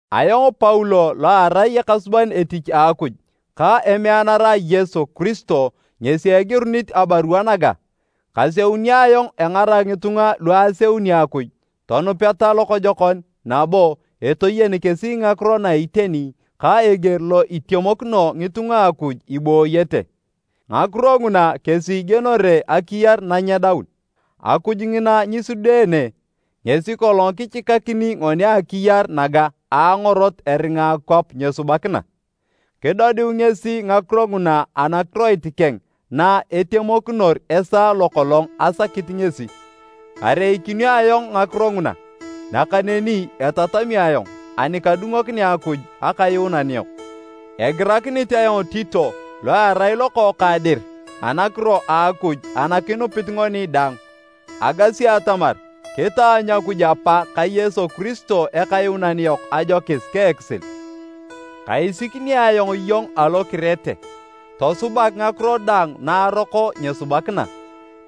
Ayong Paulo lo arai ekasuban etich a Akuj, ka emeanara a Yesu Kiristo ngesi egirunit abarua naga. Kaseunio ayong engarak ngitunga lu aseuni Akuj tonupeta lokojokon nabo etoyen kesi ngakiro na iteni ka eger lo itemokino ngitunga a Akuj ibooyete. Ngakiro nguna kesi igienore akiyar nanyedaun. Akuj ngina nyisudeene, ngesi kolong kichikakini ngoni akiyar naga a angorot eringa akwap nyesubakina. Kidodiu ngesi ngakiro nguna anakiroit keng na etemokinor esaa lo kolong asakit ngesi. Kareikinio ayong ngakiro nguna, nakaneni etatami ayong ani kadungokinea Akuj Akayuunan yok. Egirakinit ayong Tito lo erai lokookang dir anakiro a Akuj ana kinupit ngoni daang. Agasi atamar kitaanyu Akuj Apa ka Yesu Kiristo Ekayuunan yok ajokis ka ekisil. Kaisikini ayong iyong alo Kirete, tosubak ngakiro daang na aroko nyesubakina,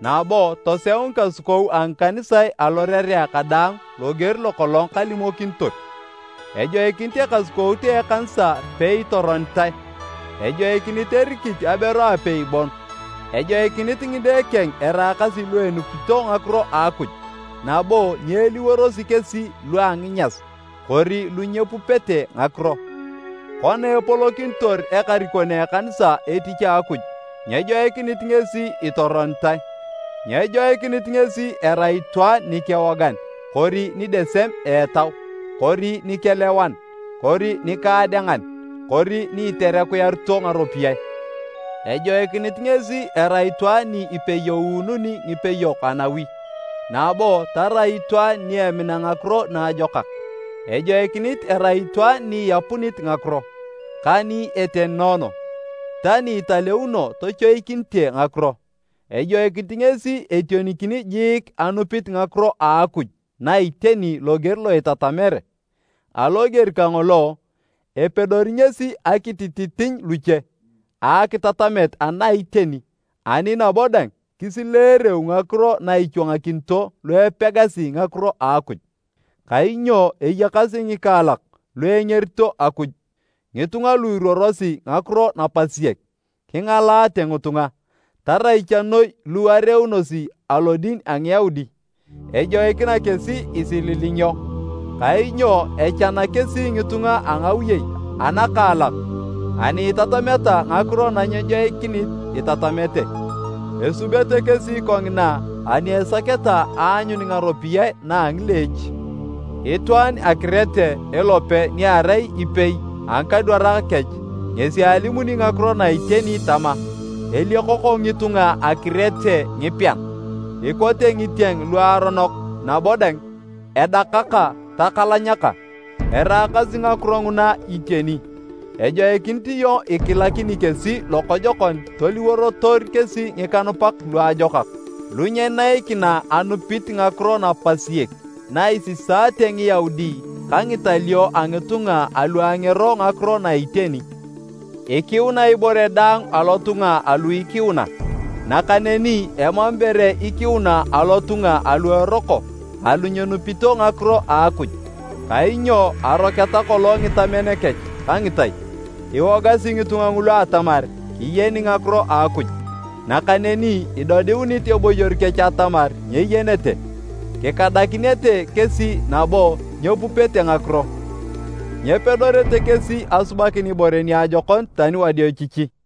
nabo toseu ngikasukou a ngikanisae alorerea kadaang loger lo kolong kalimokinitor. Ejoikinit ekasukout a ekanisa peitoronitae, ejoikinit erikit aberu apei bon. Ejoikinit ngide keng eraakasi lu enupito ngakiro a Akuj nabo nyeeliworosi kesi lua nginyas kori lu nyepupete ngakiro. Kona epolokinitor ekarikon a ekanisa etich a Akuj, nyejoikinit ngesi itoronitae. Nyejoikinit ngesi erai itwaan nikewogan kori ni edesem etau, kori nikelewan kori nikaadengan, kori ni iterekuyarito ngaropiyae. Ejoikinit ngesi erai itwaan ni ipeyoununi ngipeyok anawi, nabo tarai itwaan ni emina ngakiro naajokak. Ejoikinit erai itwaan ni iapunit ngakiro, ka ni etenoono, ta ni italeuno tochoikinite ngakiro. Ejoikinit ngesi etionikini jiik anupit ngakiro a Akuj na iteni loger lo itatamere. Aloger kangolo, epedori ngesi akitititiny luche a akitatamet ana iteni ani nabo dang kisileereu ngakiro na ichwangakinito lu epegasi ngakiro a Akuj. Kainyo eyakasi ngikaalak lu engerito Akuj, ngitunga lu iruorosi ngakiro napasiek, kingalaate ngitunga, tarai cha noi lu areeunosi alodin a Ngiyaudi. Ejoikina kesi isililingio, kainyo echana kesi ngitunga a ngawiyei anakaalak ani itatameta ngakiro na nyejoikinit itatamete, esubete kesi kongina ani esaketa aanyun ngaropiyae na a ngileech. Itwaan a Kirete elope niarai epei a ngikadwarak kech, ngesi alimuni ngakiro na iteni tama, “Eliokoko ngitunga a Kirete ngipean, ikote ngitieng luaronok nabo dang, edakaka takalanyaka.” Eraakasi ngakiro nguna iteni. Ejoikinit iyong ikilakini kesi lokojokon toliworotor kesi ngikanupak luajokak lu nyeneikina anupit ngakiro napasiek na isisaate Ngiyaudi ka ngitalio a ngitunga alu angero ngakiro na iteni. Ikiuna ibore daang alotunga alu ikiuna, nakaneni emam ibore ikiuna alotunga alu eroko alu nyenupito ngakiro a Akuj, kainyo aroketa kolong ngitamen kech ka ngitai. Iwogasi ngitunga ngulu atamar kiyeni ngakiro a Akuj, nakaneni idodiunit eboyor kech atamar nyeyenete. Kikadakinete kesi nabo nyepupete ngakiro, nyepedorete kesi asubakin ibore niajokon tani wadiochichi.